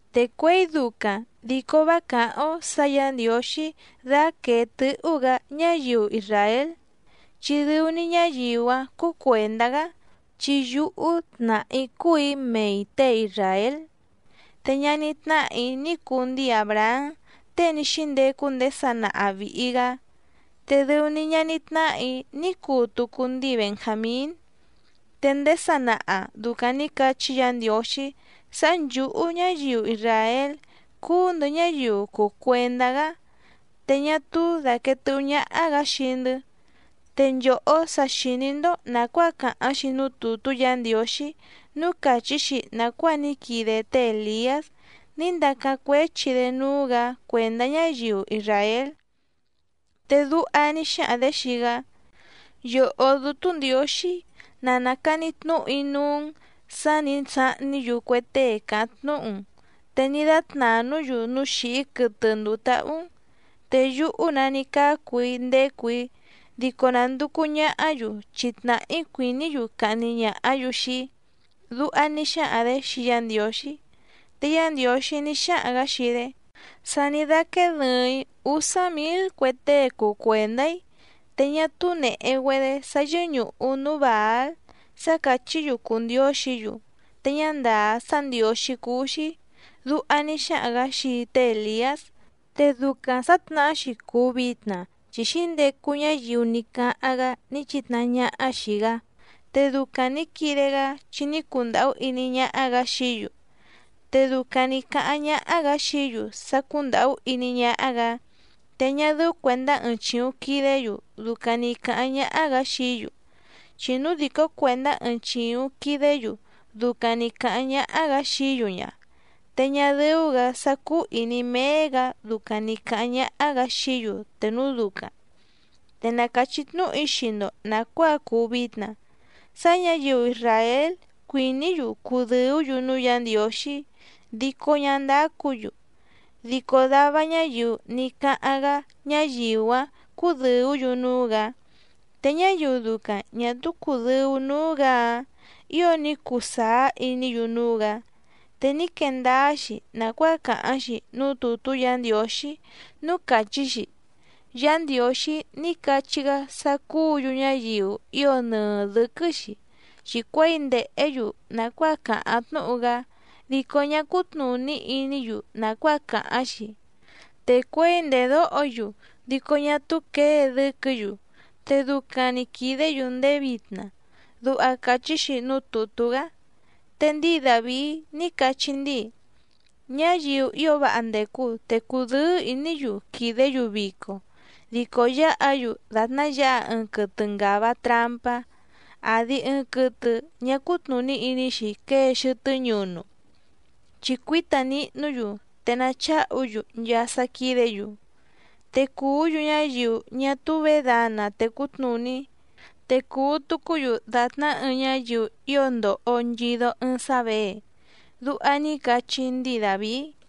Te cuěi ducaⁿ dico vá càháⁿ‑ó sǎ Yǎ Ndiǒxí dáquèe tɨ́hú‑gǎ ñáyiu isràél chi dɨu‑ni ñáyiu‑áⁿ cúú cuèndá‑gá, chi yúhú tnàhá‑í cúù‑í mei těe isràél, te ñaní tnáhà‑í ní cuu ndíi Àbrahám tée ní xíndecu ndéé sanaha vìhi‑gá, te dɨu‑ni ñaní tnáhà‑í ní cuu tucu ndíi Benjàmín. Te ndéé sanaha dùcaⁿ ní cachí Yǎ Ndiǒxí sá nchǔhú ñáyiu isràél cúú‑ndɨ̌ ñáyiu cùu cuendá‑gá, te ñá túú dàquee tɨ́hú ñáhá‑gǎ xii‑ndɨ́, te nchòhó sa xìní‑ndó nàcuáa càháⁿ‑xi núú tùtú Yǎ Ndiǒxí núú càchí‑xi nàcuáa ní quide té Èliás ní ndacáⁿ cuéchi‑dé núú‑gǎ cuèndá ñáyiu isràél. Te duha ní xáhaⁿ‑dě xii‑gá: “Yòhó Dútú Ndiǒxí, ná nàcani tnúhu‑í núú‑n sǎ nǐ sahní‑yu cue tée càháⁿ tnúhu‑n, te ní dátnànú‑yu núú xìhí quɨtɨ ndùu táhú‑n, te yúhú‑nǎ ní cácu‑í ndécù‑í dico nànducu ñahá‑yu chi tnàhá‑í cuìní‑yu cahni ñàhá‑yu xii‑í”, duha ní xáhaⁿ‑dě xii Yá Ndiǒxí. Te Yá Ndiǒxí ní xáhaⁿ‑gǎ xii‑dé: “Sa ní dáquéé dɨ̀ɨⁿ‑í úsá mǐl cue tée cùu cuendá‑í, te ñá túú nèhe‑güedé sá yɨ́ñùhu núú Bàál sá càchí‑yu cùu ndióxǐ‑yu te ñá ndàá sá ndiǒxí cúú‑xí”, duha ní xáhaⁿ‑gǎ xii té Èliás. Te ducaⁿ sǎtnahá‑xi cùu vitna chi xǐndecu ñáyiu ní cáháⁿ‑gá ní chìtnahá ñáhá xìi‑gá, te ducaⁿ nǐ quide‑gá chi ní cundàhú iní ñáhá‑gǎ xií‑yu. Te ducaⁿ nǐ cáháⁿ ñáhá‑gǎ xií‑yu sá cúndàhú iní ñáhá‑gǎ, te ñá dɨ́ú cuèndá ɨɨⁿ chìuⁿ quidé‑yu ducaⁿ nì cáháⁿ ñáhá‑gǎ xií‑yu, chi núu dìcó cuèndá ɨɨⁿ chìuⁿ quidé‑yu ducaⁿ nì cáháⁿ ñáhá‑gǎ xií‑yu ña, te ñá dɨ́ú‑gǎ sá cúú ìní méé‑gǎ ducaⁿ nì cáháⁿ ñáhá‑gǎ xií‑yu te núu ducaⁿ. Te na càchí tnúhu‑í xii‑ndo nàcuáa cùu vitna sá ñǎyiu isràél cuìní‑yu cudɨ̀ú‑yu núú Yǎ Ndiǒxí dico ñá ndácǔ‑yu, dico dava ñáyiu ní cáháⁿ‑gá ñáyiu‑áⁿ cúdɨ̀ú‑yu núú‑gǎ, te ñáyiu ducaⁿ ñà túú cùdɨu núú‑gǎ‑áⁿ ǐo ní cuu sàá iní‑yu núú‑gǎ. Te ní quee ndáá‑xi nàcuáa càháⁿ‑xi núú tùtú Yǎ Ndiǒxí núú càchí‑xi: “Yá Ndiǒxí ní cachí‑gá sá cúǔ‑yu ñáyiu ío nɨɨ dɨ̌quɨ́‑xi, chi cuěi ndèhé‑yu nàcuáa càháⁿ tnúhu‑gá dico ñá cútnùní iní‑yu nàcuáa càháⁿ‑xi, te cuěi ndèdóho‑yu dico ñá túú quěe dɨ́quɨ̌‑yu, te ducaⁿ‑ni quìdé‑yu ndéé vitna”, duha càchí‑xi núú tùtú‑gá. Te ndíi Dàvií ní cachí ndíi: Ñáyiu ío váha ndècu te cùdɨ́ɨ́ ìní‑yu quìdé‑yu vico, dico yáha‑yu dàtná yǎha ɨɨⁿ quɨtɨ ngàva trampá àdi ɨɨⁿ quɨtɨ ñá cútnùní iní‑xi quée xɨtɨ́ ñunu, chi cuíta nihnú‑yu te nacháhu‑yu nchaa sá quídě‑yu. Te cùú‑yu ñáyiu ñá túú vědana tècú tnùní, te cùu tucú‑yu dàtná ɨɨⁿ ñáyiu ío ndòho nchido ɨɨⁿ sá věe. Duha ní cachí ndíi Dàvií.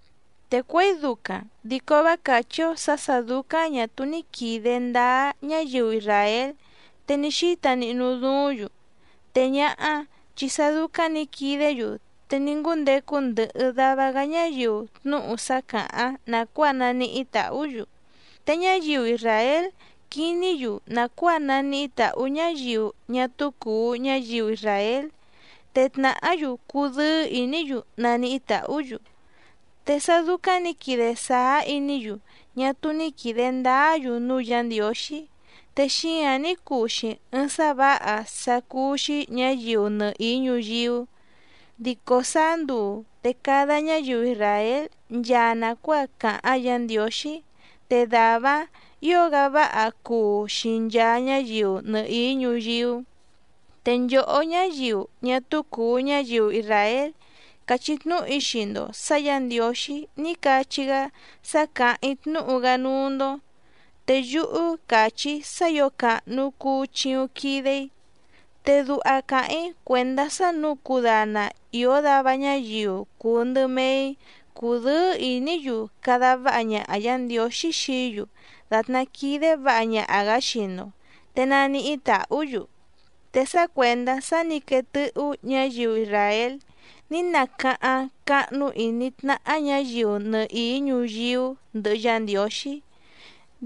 Te cuěi ducaⁿ dico vá càchí‑ó sǎ sà dúcáⁿ ñà túú ní quìde ndáá ñáyiu isràél te ní xíta nihnu duúⁿ‑yu, te ñáhá chi sá dúcáⁿ nǐ quidé‑yu te ní ngúndecu ndɨhɨ dava‑gá ñáyiu tnúhu sá càháⁿ nàcuáa naníhí tàhú‑yu, te ñáyiu isràél quiní‑yu nàcuáa naníhí tàhú ñáyiu ñá túú cùu ñáyiu isràél, te tnàhá‑yu cudɨ́ɨ́ ìní‑yu naníhí tàhú‑yu. Te sá dúcáⁿ nǐ quide sàá iní‑yu ñá túú ní quìde ndáá‑yu núú Yǎ Ndiǒxí, te xíǎⁿ ní cuu‑xi ɨɨⁿ sá vǎha sá cúú‑xí ñǎyiu nɨhìí ñuyíú, dico sáá nduu te cada ñáyiu isràél nchaa nàcuáa càháⁿ Yǎ Ndiǒxí, te dàvá‑áⁿ ǐo‑gá váha cuu xii nchaa ñáyiu nɨhìí ñuyíú. Te nchòhó ñáyiu ñá túú cùu ñáyiu isràél càchí tnúhu‑í xii‑ndo sǎ Yǎ Ndiǒxí ní cachí‑gá sá càháⁿ‑í tnúhu‑gá núú‑ndó, te yúhú càchí‑í sá ǐo càhnu cuu chiuⁿ quide‑í. Te duha càháⁿ‑í cuèndá sá nǔu cudana ìó dava ñáyiu cùu ndɨ mee‑í cudɨ́ɨ́ ìní‑yu cada váha ñaha Yǎ Ndiǒxí xií‑yu dàtná quídé vǎha ñaha‑gǎ xii‑ndo, te naníhí tàhú‑yu. Te sá cuèndá sá nǐ quee tɨ́hú ñǎyiu isràél ní nacáháⁿ cáhnú ìní tnáhá ñǎyiu nɨhìí ñuyíú ndɨhɨ Yá Ndiǒxí,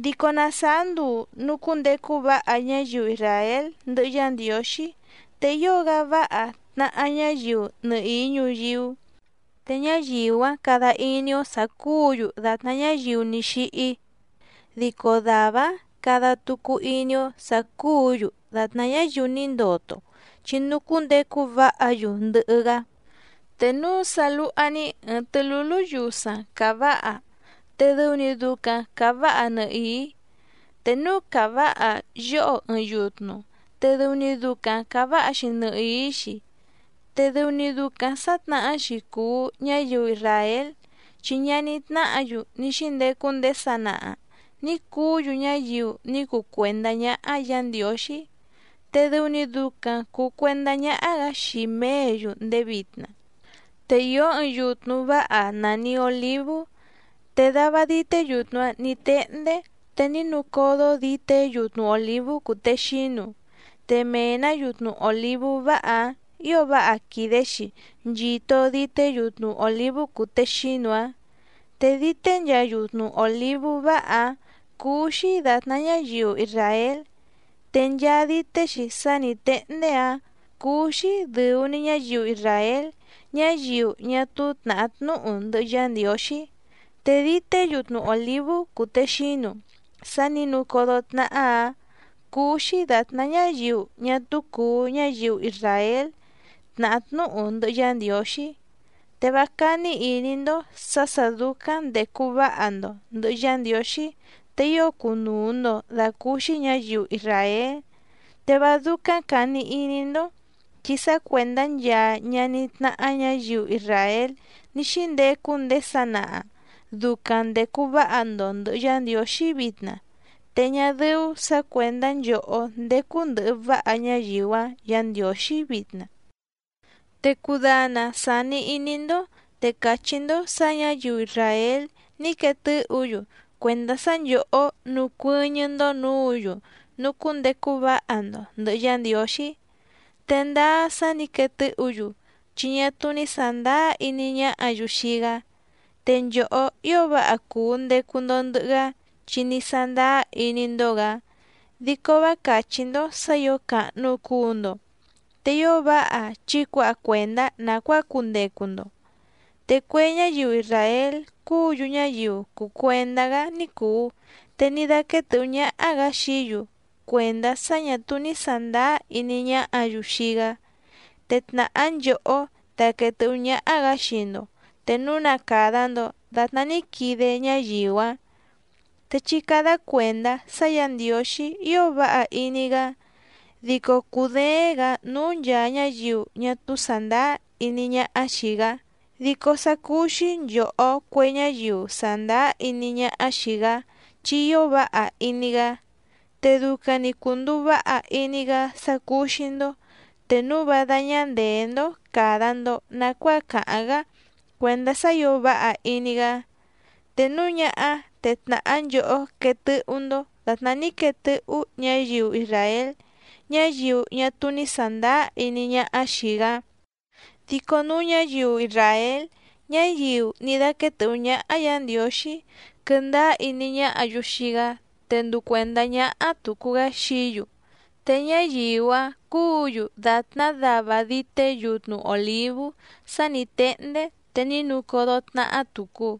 dico na sàá nduu nùcúndecu váha ñáyiu isràél ndɨhɨ Yá Ndiǒxí, te ío‑gá váha tnahá ñáyiu nɨhìí ñuyíú, te ñáyiu‑áⁿ cada iní‑ó sǎ cúǔ‑yu dàtná ñáyiu ní xíhí, dico dàvá‑áⁿ cada tucu iní‑ó sǎ cúǔ‑yu dàtná ñáyiu ní ndoto chi nucúndecu váha‑yu ndɨhɨ‑gá. Te núu sá lúhá‑ní ɨ̀ɨⁿ tɨ́lúlú yusaⁿ càváha te dɨu‑ni ducaⁿ càváha nɨhìí. Te núu càváha yóho ɨɨⁿ yutnu te dɨu‑ni ducaⁿ càváha‑xi nɨhìí‑xi. Te dɨu‑ni ducaⁿ sǎtnahá‑xi cùu ñáyiu isràél, chi ñaní tnáhǎ‑yu ní xíndecu ndéé sanaha nǐ cuú‑yu ñáyiu ní cuu cuèndá ñáhá Yǎ Ndiǒxí, te dɨu‑ni ducaⁿ cùu cuendá ñáhá‑gǎ xii mèé‑yu ndéé vitna. Te ìó ɨɨⁿ yutnu váha nàni olívú, te dava dité yutnu‑áⁿ nǐ téhndé te ní nucódó dìté yutnu òlívú cùtexínu, te mee‑nǎ yutnu òlívú váha‑áⁿ ǐo váha quìde‑xi nchito dité yutnu òlívú cùtexínu‑áⁿ. Te dité nchaa yutnu òlívú váha‑áⁿ cúú‑xí dàtná ñáyiu isràél, te nchaa dité‑xi sá nǐ téhndé‑áⁿ cúú‑xí dɨ̀u‑ni ñáyiu isràél ñáyiu ñá túú tnàhá tnúhu ndɨhɨ Yá Ndiǒxí. Te dité yutnu òlívú cùtexínu sá nǐ nucódó tnáhá‑ǎⁿ cúú‑xí dàtná ñáyiu ñá túú cùu ñáyiu isràél tnàhá tnúhu ndɨhɨ Yá Ndiǒxí. Te vá cání ìní‑ndó sǎ sà dúcáⁿ ndècu váha‑ndo ndɨ̀hɨ Yá Ndiǒxí te ío cùnuu‑ndo dacúúxí ñǎyiu isràél, te vá dúcáⁿ càni iní‑ndó chi sá cuèndá nchaa ñaní tnáhá ñǎyiu isràél ní xíndecu ndéé sanaha ducaⁿ ndècu váha‑ndo ndɨ̀hɨ Yá Ndiǒxí vitna, te ñá dɨ́ú sǎ cuèndá nchòhó ndécú ndɨ̀hɨ váha ñáyiu‑áⁿ Yǎ Ndiǒxí vitna. Te cudana sàni iní‑ndó te càchí‑ndó sǎ ñǎyiu isràél ní quee tɨ́hǔ‑yu cuèndá sá nchòhó nucuɨ́ñɨ́‑ndó nǔǔ‑yu nucúndecu váha‑ndo ndɨ̀hɨ Yá Ndiǒxí. Te ndáá sá nǐ quee tɨ́hǔ‑yu chi ñá túú ní sàndáá iní ñáhǎ‑yu xii‑gá, te nchòhó ío váha cùu ndecu‑ndo ndɨhɨ‑gá chi ní sándáá iní‑ndó‑gǎ, dico vá càchí‑ndó sǎ ǐo càhnu cuu‑ndo, te ío váha chí cuǎha cuèndá nàcuáa cundecu‑ndo. Te cue ñáyiu isràél cúǔ‑yu ñáyiu cùu cuendá‑gá ní cùu te ní dáquéé tɨ̌hú ñáhá‑gǎ xií‑yu cuèndá sá ñà túú ní sàndáá iní ñáhǎ‑yu xii‑gá, te tnàhá nchòhó daquèe tɨ́hú ñáhá‑gǎ xii‑ndo te núu na càda‑ndo datná ní quide ñáyiu‑áⁿ. Te chí cádá cuèndá sá Yǎ Ndiǒxí ío váha iní‑gá, dico cùdééⁿ‑gǎ núú nchàa ñáyiu ñá túú sàndáá iní ñáhá xìi‑gá, dico sá cúú‑xí nchòhó cue ñáyiu sàndáá iní ñáhá xìi‑gá chi ío váha iní‑gá. Te ducaⁿ‑ni cùnduu váha iní‑gá sá cúú‑xí‑ndó te núu vá dáñá ndèé‑ndó càda‑ndo nacuáa càháⁿ‑gá cuèndá sá ǐo váha iní‑gá, te núu ñáhá te tnàhá nchòhó quee tɨ́hú‑ndó dàtná ní quee tɨ́hú ñǎyiu isràél, ñáyiu ñá túú ní sàndáá iní ñáhá xìi‑gá. Dico núu ñáyiu isràél ñáyiu ní dáquéé tɨ̀hú ñáhá Yǎ Ndiǒxí quɨ́ndáá iní ñáhǎ‑yu xii‑gá te nduu cuèndá ñáhá tùcu‑gá xií‑yu, te ñáyiu‑áⁿ cúǔ‑yu dàtná dava dité yutnu òlívú sá nǐ téhndé te ní nucódó tnáhá tùcu.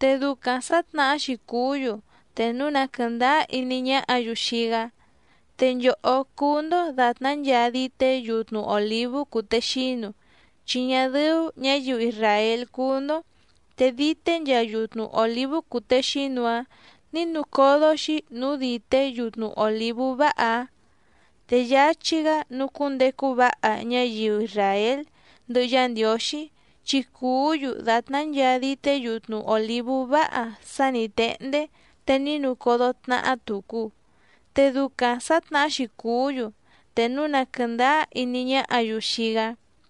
Te ducaⁿ sǎtnahá‑xi cùú‑yu te núu na quɨ̀ndáá iní ñáhǎ‑yu xii‑gá. Te nchòhó cúú‑ndó dàtná nchaa dité yutnu òlívú cùtexínu, chi ñá dɨ́ú ñǎyiu isràél cúú‑ndó, te dité nchaa yutnu òlívú cùtexínu‑áⁿ nǐ nucódó‑xi núú dìté yutnu òlívú váha‑áⁿ. Te yáchí‑gá nucúndecu váha ñáyiu isràél ndɨhɨ Yá Ndiǒxí, chi cùú‑yu dàtná nchaa dité yutnu òlívú váha sá nǐ téhndé te ní nucódó tnáhá tùcu. Te ducaⁿ sǎtnahá‑xi cùú‑yu te núu na quɨ̀ndáá iní ñáhǎ‑yu xii‑gá.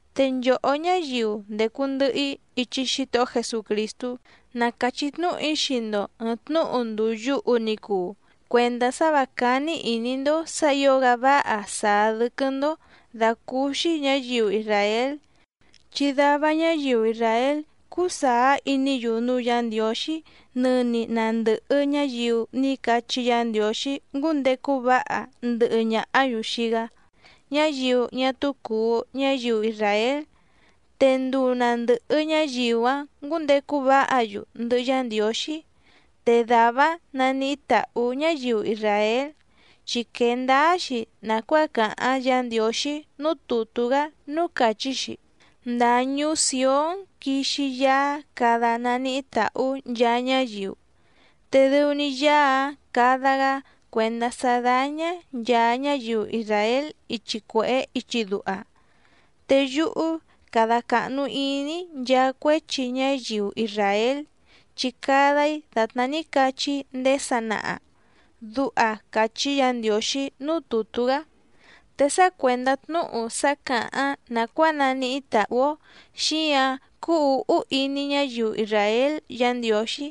Te nchòhó ñáyiu ndècu ndɨhɨ‑í ichi Xítohó Jesucrìstú, na càchí tnúhu‑í xii‑ndo ɨ̀ɨⁿ tnúhu ndùu yuhu ni cuu, cuèndá sá vǎ cání ìní‑ndó sǎ ǐo‑gá váha sàá dɨ́quɨ́‑ndó dàcúúxí ñǎyiu isràél, chi dava ñáyiu isràél cúú sàá iní‑yu núú Yǎ Ndiǒxí nɨni na ndɨ̀hɨ ñáyiu ní cachí Yǎ Ndiǒxí ngúndecu váha ndɨhɨ ñàhá‑yu xii‑gá, ñáyiu ñá túú cùu ñáyiu isràél. Te nduu na ndɨ̀hɨ ñáyiu‑áⁿ ngǔndecu váha‑yu ndɨhɨ Yá Ndiǒxí, te dàvá‑áⁿ naníhí tàhú ñáyiu isràél chi quee ndáá‑xi nàcuáa càháⁿ Yǎ Ndiǒxí núú tùtú‑gá núú càchí‑xi: Ndàa ñuú Sìón quixi Yaá cada naníhí tàhú nchaa ñáyiu, te dɨu‑ni Yaá‑áⁿ cada‑gá cuèndá sá dáñá nchàa ñáyiu isràél ichi cuèhé ichi duha. Te yúhú cada càhnu iní‑í nchaa cuéchi ñáyiu isràél, chi cada‑í dàtná ní cachí‑í ndéé sanaha. Duha càchí Yǎ Ndiǒxí núú tùtú‑gá. Te sá cuèndá tnúhu sá càháⁿ nàcuáa naníhí tàhú‑ó xíǎⁿ cúú ǔhú iní ñáyiu isràél Yǎ Ndiǒxí,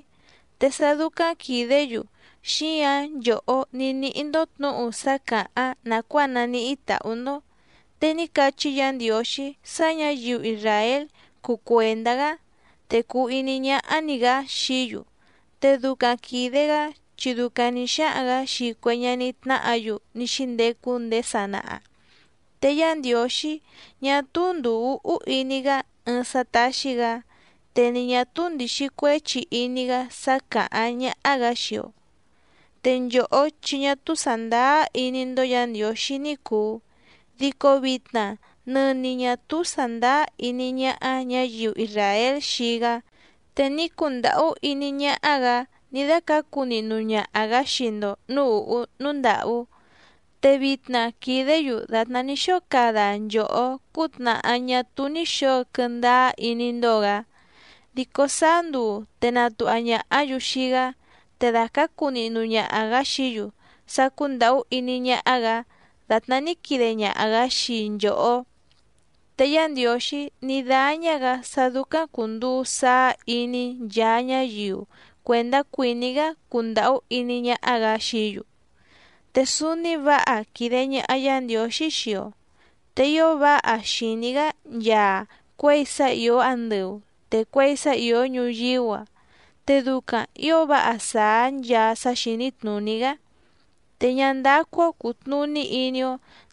te sá dúcáⁿ quìdé‑yu xíǎⁿ nchòhó ní níhí‑ndó tnǔhu sá càháⁿ nàcuáa naníhí tàhú‑ndó. Te ní cachí Yǎ Ndiǒxí sá ñǎyiu isràél cuu cuèndá‑gá, te cùu iní ñáhá‑ní‑gǎ xií‑yu, te ducaⁿ quìde‑gá chi ducaⁿ nǐ xáhaⁿ‑gǎ xii cue ñaní tnáhǎ‑yu ní xíndecu ndéé sanaha. Te Yá Ndiǒxí ñá túú ndùu úhú iní‑gá ɨɨⁿ sá táxí‑gǎ, te ni ñà túú ndìxi cuéchi iní‑gá sá càháⁿ ñáhá‑gǎ xii‑o. Te nchòhó chi ñá túú sàndáá iní‑ndó Yǎ Ndiǒxí ní cùu, dico vitna nɨni ñà túú sàndáá iní ñáhá ñǎyiu isràél xii‑gá, te ní cundàhú iní ñáhá‑gǎ ní dácǎcu nihnu ñaha‑gǎ xii‑ndo nǔú ùhú núú ndàhú. Te vitna quìdé‑yu dàtná ní xóo cada nchòhó cútnàhá ñá túú ní xǒo quɨndáá iní‑ndó‑gǎ. Dico sáá nduu te natuha ñàhá‑yu xii‑gá te dàcácu nihnu ñaha‑gǎ xií‑yu sá cúndàhú iní ñáhá‑gǎ dàtná ní quide ñaha‑gǎ xii nchòhó. Te Yá Ndiǒxí ní dáñá‑gǎ sá dúcáⁿ cùnduu saá iní nchaa ñáyiu cuèndá cuìní‑gá cundàhú iní ñáhá‑gǎ xií‑yu. Te súúní vǎha quìde ñaha Yá Ndiǒxí xii‑o, te ío váha xìní‑gá nchaa cuěi sá ìó andɨu te cuěi sá ìó ñuyíú‑a, te ducaⁿ ǐo váha sàá nchaa sá xìní tnùní‑gá. Te ñá ndácú‑ó cùtnuní iní‑ó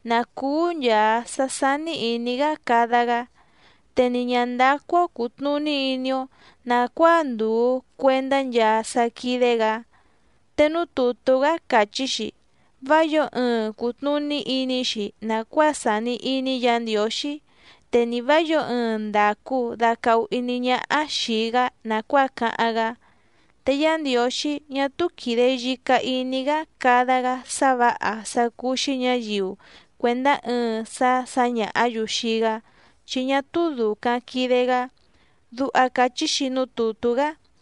nǎ cúú nchàa sá sání ìní‑gá cada‑gá, te ni ñǎ ndácú‑ó cùtnuní iní‑ó nàcuáa ndùu cuendá nchaa sá quídé‑gǎ. Te núú tùtú‑gá càchí‑xi: “Vá yǒo ɨɨⁿ cùtnuní iní‑xi nàcuáa sàni iní Yǎ Ndiǒxí, te ni vǎ yǒo ɨɨⁿ ndàcu dacahu iní ñáhá xìi‑gá nàcuáa cáháⁿ‑gá. Te Yá Ndiǒxí ñá túú quìde yica iní‑gá cada‑gá sá vǎha sá cúú‑xí ñǎyiu cuèndá ɨɨⁿ sá sǎñàhá‑yu xii‑gá chi ñá túú dùcaⁿ quide‑gá”, duha càchí‑xi núú tùtú‑gá.